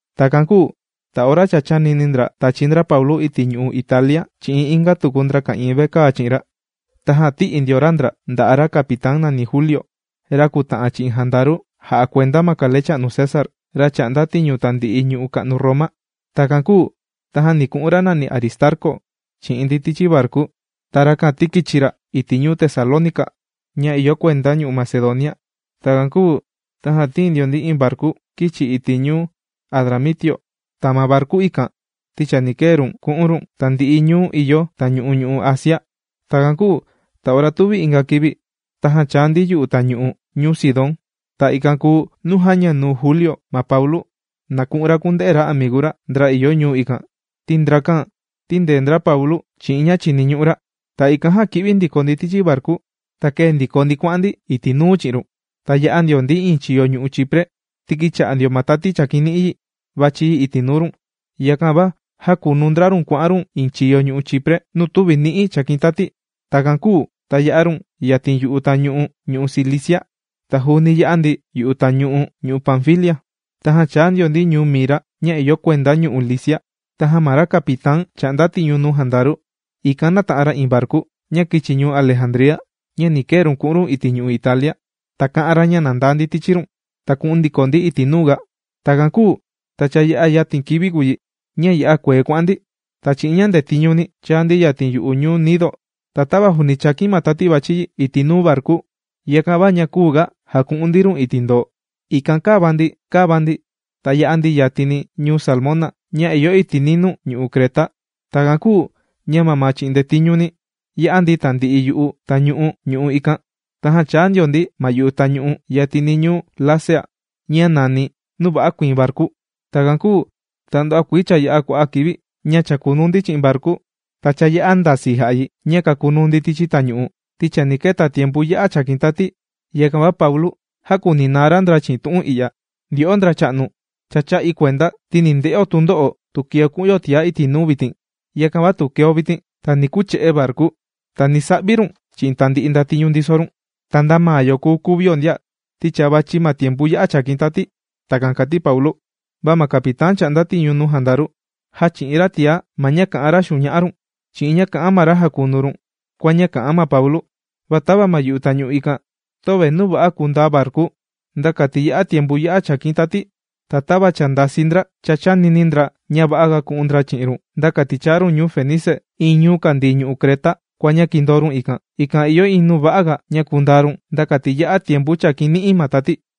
Takan kūu ta ora cha chānini ndra tachi ndra Paulu iti' ñu'u' Italia chi'in inga tuku ndra ka'ìin vekaa chi'in ra, tajan tī'i ndio ra ndra nda'a' ra capitán nàni Juliu, ra kùta'an chi'in jandaru jà'a kuenda ma kalecha'nu César, ra chà'nda tiñu tandi'i ñuu ka'nu Roma. Takan kūu tajan ni ku'un ra nàni Aristarcu chi'in ndi tichi varku. Ta rakan ti kīchi ra iti' ñuu Tesalónica ña ìyo kuenda ñu'u' Macedonia. Takan kūu tajan tīin ndio ndi iin varku kīchi iti' ñuu Adramitio. Ta ma varku ikan, ti chani kee run ku'un run tandi'i ñuu ìyo tañu'u ñu'u' Asia. Takan kūu ta ora tuvi inga kivi, tajan chāa ndi yu'u tañu'u ñuu Sidón. Ta ikan kùu nuu jāña nuu Juliu, ma Paulu, na ku'un ra kunde'e ra amigu ra ndra ìyo ñuu ikan. Ti ndrakan tīndee ndra Paulu chi'in ña chìniñu'u ra. Ta ikan jan kī'vi ndiko ndi tichi varku, ta kēe ndiko ndi kuà'an ndi iti' nuu chi'in run. Ta yā'a ndio ndi iin chiyo ñu'u' Chipre, ti kīcha'a ndio ma tati chàkin ni'i yi, vàchi yi iti' nuu run. Yakan va jākunu ndra run kuà'an run iin chiyo ñu'u' Chipre nuu tüvi ni'i chàkin tati. Takan kūu ta yā'a run yatin yu'u tañu'u ñu'u' Cilicia. Ta juuni yā'a ndi yu'u tañu'u ñu'u' Panfilia. Tajan chāa ndio ndi ñuu Mira ña ìyo kuenda ñu'u' Licia. Tajan ma ra capitán chà'nda tiñu nuu jandaru, ikan nāta'an ra iin varku ña kīchi ñuu Alejandría ña ni kee run ku'un run iti' ñu'u' Italia. Ta kā'an ra ña na ndaa ndi tichi run, ta ku'un ndiko ndi iti' nuu ga. Takan kūu ta cha yā'a yatin kivi ña ya'a kuee kuà'an ndi. Ta chi'in ña ndetiñu ni chāa ndi yatin yu'u ñuu Gnido. Ta tava juuni chàkin ma tati vàchi yi iti' nuu varku, yakan va küu ga jaku'un ndi run iti' ndoo. Ikan kàva ndi kàva ndi ta yā'a ndi yatini ñuu Salmón ña ìyo iti' ninuu ñu'u' Creta. Takan kūu ña mamaa chi'in ña ndetiñuni, yā'a ndi tandi'i yu'u tañu'u ñu'u' ikan. Tajan chāa ndio ndi ma yu'u tañu'u yatini ñuu Lasea ña nàni: Nuu Va'a Kuiin Varku. Takan kūu ta nduva'a kuii cha yā'a kua'a' kivi ña chàkunuu ndi chi'in varku. Ta cha ya'a ndasii jà'a yi ña kakunuu ndi tichi tañu'u, ti chani keta tiempu ya'a chàkin tati. Yakan va Paulu jākuninaa ra ndra chi'in tu'un i'ya: ―Ndyo'o ndracha'nu, cha chā'i kuenda ti ni nde'o tundo'o tu keo ku'un yo tiaga iti' nuu vitin. Yakan va tu keo vitin, ta ni kuche'e varku ta ni sa'vi run chi'in tandi'i ndatiñu ndiso run. Ta nda maa yo kùu kuvio ndia ti cha vàchi ma tiempu ya'a chàkin tati. ―Takan kàti Paulu. Va ma capitán chà'nda tiñu nuu jandaru, jāchi'in ra tiá ma ña kà'an ra xuña'a run chi'in ña kà'an ma ra jakunu run kua ña kà'an ma Paulu. Va tava ma yu'u tañu'u ikan, töve nuu va'a kundaa varku nda kati ya'a tiempu ya'a chàkin tati. Ta tava cha ndisaa ndra cha chānini ndra ña va'aga ku'un ndra chi'in run nda kati chaa run ñuu Fenice iin ñuu kàndii ñu'u' Creta kua ña kindoo run ikan. Ikan ìyo iin nuu va'aga ña kundaa run nda kati ya'a tiempu chàkin ni'i ma tati.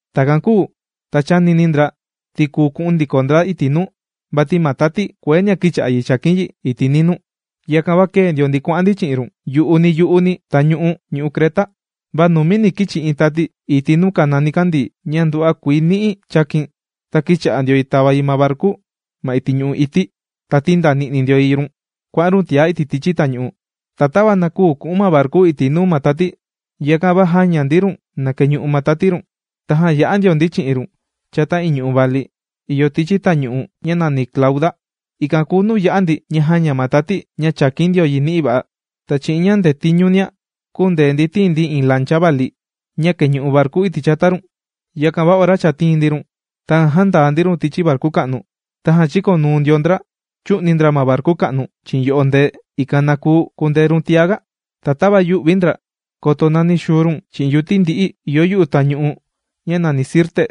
Takan kūu ta chānini ndra ti kùu ku'un ndiko ndra iti' nuu, vati ma tati kueenia kīcha'a yi chàkin yi iti' ninuu. Yakan va kēe ndio ndi kuà'an ndi chi'in run yu'uni yu'uni tañu'u ñu'u' Creta. Va nunuuni kīchi iin tati iti' nuu kàna nikandii ña nduva'a kuii ni'i chākin. Ta kīcha'a ndio yi tava yi ma varku ma iti' ñu'u' ití. Ta tìndani'ni ndio yi run kuà'an run tiá iti' tichi tañu'u. Ta tava na küu ku'un ma varku iti' nuu ma tati, yakan va jāña ndi run na keñu'u ma tati run. Tajan yā'a ndio ndi chi'in run chata iin ñu'u' vali ìyo tichi tañu'u ña nàni Clauda, ikan kùu nuu yā'a ndi ña jāña ma tati ña chàkin ndio ni'i va'a. Ta chi'in ña ndetiñunia kūndee ndi tiin ndi iin lancha vali ña kèñu'u varku iti' chata run. Yakan va ora cha tīin ndi run, tajan jāndaa ndi run tichi varku ka'nu. Tajan chīkonuu ndio ndra chū'ni ndra ma varku ka'nu chi'in yo'o ndee, ikan na kuu kundee run tiaga. Ta tava yū'vi ndra koto nani xuu run chi'in yuti ndi'i ìyo yu'u tañu'u ña nàni Sirte,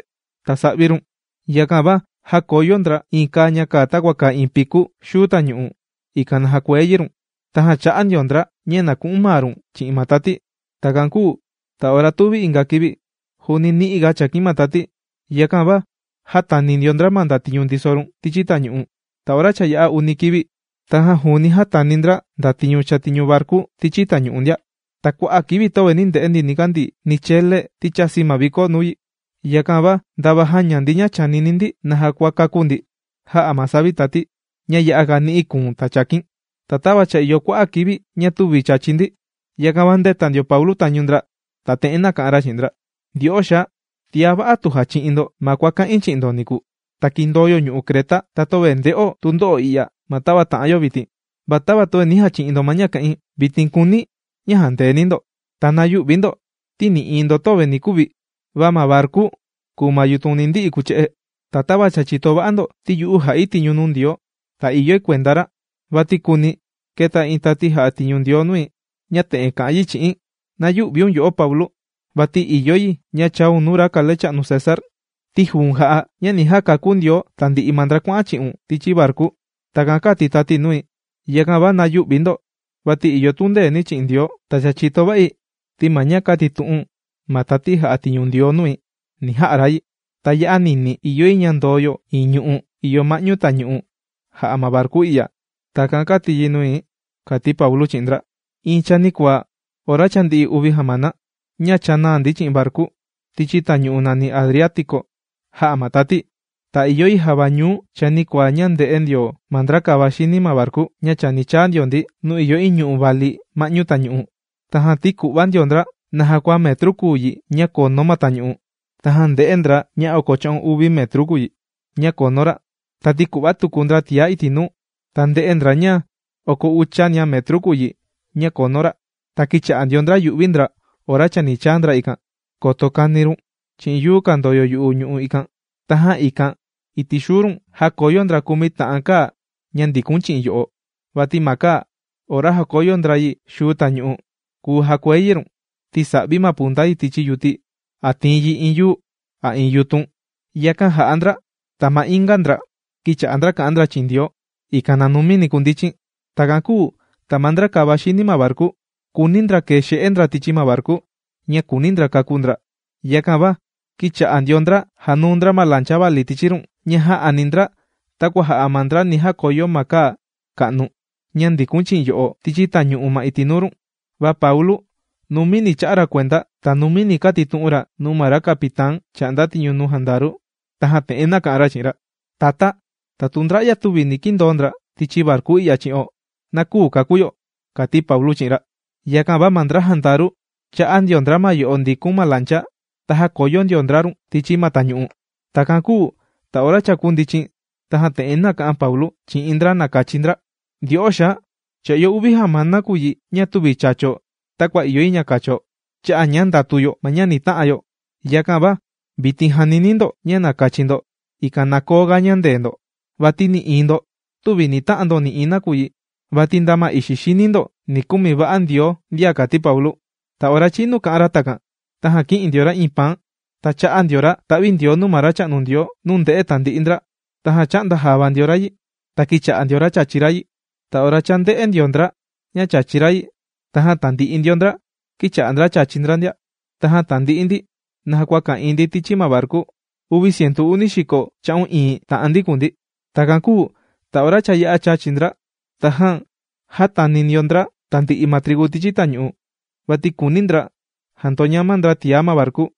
ta sa'vi run. Yakan va jākoyo ndra iin kaa ña kàa takua kàa iin picu xuu tañu'u, ikan na jakuee yi run. Tajan chā'a ndio ndra ña na ku'un maa run chi'in ma tati. Takan kūu ta ora tuvi inga kivi juuni ni'iga chàkin ma tati. Yakan va jātani ndio ndra ma ndatiñu ndiso run tichi tañu'u. Ta ora cha yā'a uni kivi tajan juuni jātani ndra ndatiñu chàtiñu varku tichi tañu'u ndia. Ta kua'a' kivi töve nī nde'e ndi nikandii ni chele, ti chāsi ma viko nuu yi. Yakan va ndava jāña ndi ña chànini ndi naja kua kakú ndi, jā'a ma savi tati ña ya'aga ni'i kùu̱n ta chàkin. Ta tava cha ìyo kua'a' kivi ña tüvi chàchi ndi, yakan va ndēta ndio Paulu tañu ndra, ta te'en nāka'an ra chi'in ndra: ―Ndyo'o xaa, tiá va'a tu jāchi'in ndo ma kua kā'in chi'in ndo niku, ta kìndoo yo ñu'u' Creta, ta töve nde'o tundo'o i'ya ma tava tà'an yo vitin. Va tava töve nī jachi'in ndo ma ña kā'in, vitin kùuni̱ na jandeeni ndo. Ta na yü'vi ndo, ti nï'iin ndo tüvi ni kuvi. Va ma varku kùu ma yutun ni ndi'i kuche'e. Ta tava cha chìto va'a ndo, ti yu'u jà'i tiñu nuu Ndioo. Ta ìyoi kuenda ra. Vati kuni, kēta iin tati jà'a tiñu nuu Ndioo nui ña te'en kā'an yi chi'i̱n: “Na yü'viun, yo'o Paulu, vati ìyo yi ña chaun nuu ra kalecha'nu César. Ti juu̱n, jà'a ña ni jakakú Ndioo tandi'i ma ndra kuà'an chi'un tichi varku.” Takan kāti tati nui. Yakan va na yü'vi ndo, vati ìyo tundeeni̱ chi'in Ndioo. Ta cha chìto va'i, ti ma ña kātitu'un ma tati jà'a tiñu Ndioo nui, ni ja'a ra yi. Ta ya'a ninii ìyo yi ña ndoo yo iin ñu'u' ìyo ma'ñu tañu'u jà'a ma varku i'ya. Takan kāti yi nui ―kàti Paulu chi'in ndra. Iin chanikuaa ora cha ndi'i uvi jamana ña chànaa ndi chi'in varku tichi tañu'u nàni Adriático jā'a ma tati, ta ìyo yi a java ñuu chanikuaa ña ndē'e ndio ma ndra kàvaxini ma varku ña chani chaa ndio ndi nuu ìyo iin ñu'u' vali ma'ñu tañu'u. Tajan tīku'va ndio ndra naja kua metru kùu yi ña kunu ma tañu'u. Tajan ndē'e ndra ña oko cha'un uvi metru kùu yi ña kunu ra. Ta tīku'va tuku ndra tiá iti' nuu, ta ndē'e ndra ña oko uchania metru kùu yi ña kunu ra. Ta kīcha'a ndio ndra yu'vi ndra ora chani chaa ndra ikan, koto kani run chi'in yuu kàndoyo yu'u ñu'u' ikan. Tajan ikan iti' xuu run jākoyo ndra kumi ta'an kaa ña ndīkun chi'in yo'o. Vati ma kaa ora jàkoyo ndra yi xuu tañu'u, kùu jakuee yi run. Ti sà'vi ma punta yi tichi yuti a tìin yi iin yuu a iin yutun. Yakan jà'a ndra, ta ma inga ndra kīcha'a kà'an ndra chi'in Ndioo, ikan na numini kundichin. Takan kūu ta ma ndra kàvaxini ma varku kùuni ndra kee xe'e ndra tichi ma varku, ña kùuni ndra kakú ndra. Yakan va kīcha'a ndio ndra jànuu ndra ma lancha vali tichi run ña jā'ani ndra takua jà'a ma ndra ni jakoyo ma kaa ka'nu ña ndikun chi'in yo'o tichi tañu'u ma iti' nuu run. Va Paulu numini chā'a ra kuenda, ta numini kātitu'un ra nuu ra capitán chà'nda tiñu nuu jandaru. Tajan te'en nāka'an ra chi'in ra: ―Tatá, ta tu ndra'ya tüvi ni kindoo ndra tichi varku i'ya chi'o, na küu kakú yo ―kàti Paulu chi'in ra. Yakan va ma ndra jandaru chā'nda ndio ndra ma yo'o ndikun ma lancha, ta jākoyo ndio ndra run tichi ma tañu'u. Takan kūu ta ora kūndichin, tajan te'en nāka'an Paulu chi'in ndra na kachi ndra: ―Ndyo'o xaa, cha ìyo uvi jamana kùu yi ña tüvi chācho takua ìyo yi ña kacho, cha'a' ña ndàtu yo ma ña ni ta'an yo. Yakan va vitin jànini̱ ndo ña na kachi ndo, ikan na koo ga ñandee ndo. Vati nï'iin ndo tüvi ni ta'an ndo nï'iin nakuyi, vati nda ma ixi xini ndo ni kumi va'a ma Ndioo ndia ―kàti Paulu. Ta ora chinu kā'an ra takan, tajan kī'in ndio ra iin paan. Tajan chā'a ndio ra ta'vindioo nuu ma Racha'nu Ndioo nuu ndē'e tandi'i ndra. Tajan chā'nda java ndio ra yi, ta kīcha'a ndio ra chàchi ra yi. Ta ora cha ndē'e ndio ndra ña chàchi ra yi, tajan tandi'i ndio ndra kīcha'a chàchi ndra ndia. Ta tandi'i ndi naja kua ka'ìin ndi tichi ma varku, uvi cientu uni xiko cha'un iin ta'an ndi kùu ndi. Takan kūu ta ora cha yā'a chàchi ndra, tajan jātani ndio ndra tandi'i ma trigu tichi tañu'u, vati kùuni ndra jandoñama ndra tiá ma varku.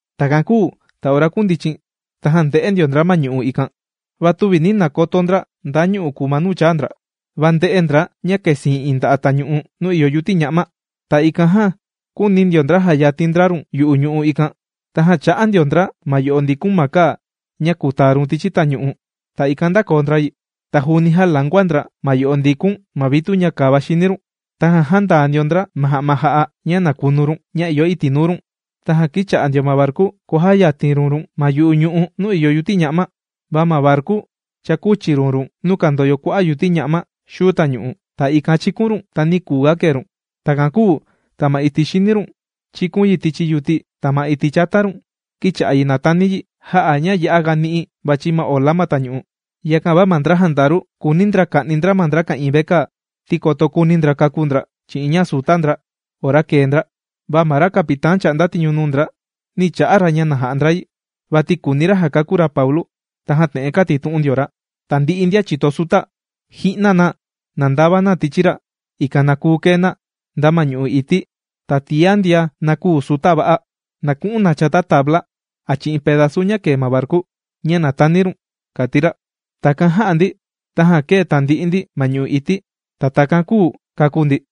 Takan kūu ta ora kūndichin, tajan ndē'e ndio ndra ma ñu'u' ikan. Va tüvi nī nakoto ndra nda ñu'u' kùu ma nuu chāa ndra. Va ndē'e ndra ña kèsiin iin nda'a' tañu'u nuu ìyo yuti ña'ma. Ta ikan jan kūuni ndio ndra jayatin ndra run yu'u ñu'u' ikan. Tajan chā'nda ndio ndra ma yo'o ndikun ma kaa ña kùtaa run tichi tañu'u, ta ikan ndākoo ndra yi. Ta juuni jālangua ndra ma yo'o ndikun ma vitu ña kàvaxini run. Tajan jāndaa ndio ndra ma ja'ma jà'a ña na kunu run ña ìyo iti' nuu run. Tajan kīcha'a ndio ma varku kua jàkuyatin run run ma yu'u ñu'u' nuu ìyo yuti ña'ma. Va ma varku cha kūchi run run nuu kàndoyo kua'a' yuti ña'ma xuu tañu'u. Ta ikan chīkun run ta nī kuu ga kee run. Takan kūu ta ma iti' xini run chīkun yi tichi yuti. Ta ma iti' chata run, kīcha'a yi nàtani yi, jā'a ña ya'a ni'i vàchi ma ola ma tañu'u. Yakan va ma ndra jandaru kùuni ndra ka'ni ndra ma ndra ka'ìin vekaa, ti koto kuuni ndra kakú ndra chi'in ña sùta ndra ora kèe ndra. Va ma ra capitán ña chà'nda tiñu nuu ndra, nī cha'a ra ña na ja'a ndra yi, vati kùuni ra jakakú ra Paulu. Tajan te'en kātitu'un ndio ra: ―Tandi'i ndian chìto suta, ji'na na, na ndava tichi ra', ikan na kuu kee na nda ma ñu'u' ití. Ta tiá ndian na küu suta va'a, na ku'un na chata tabla a chi'in pedazu ña kèe ma varku ña na tani run ―kàti ra. Takan jā'a ndi, tajan kēe tandi'i ndi ma ñu'u' ití, ta takan kūu kākú ndi.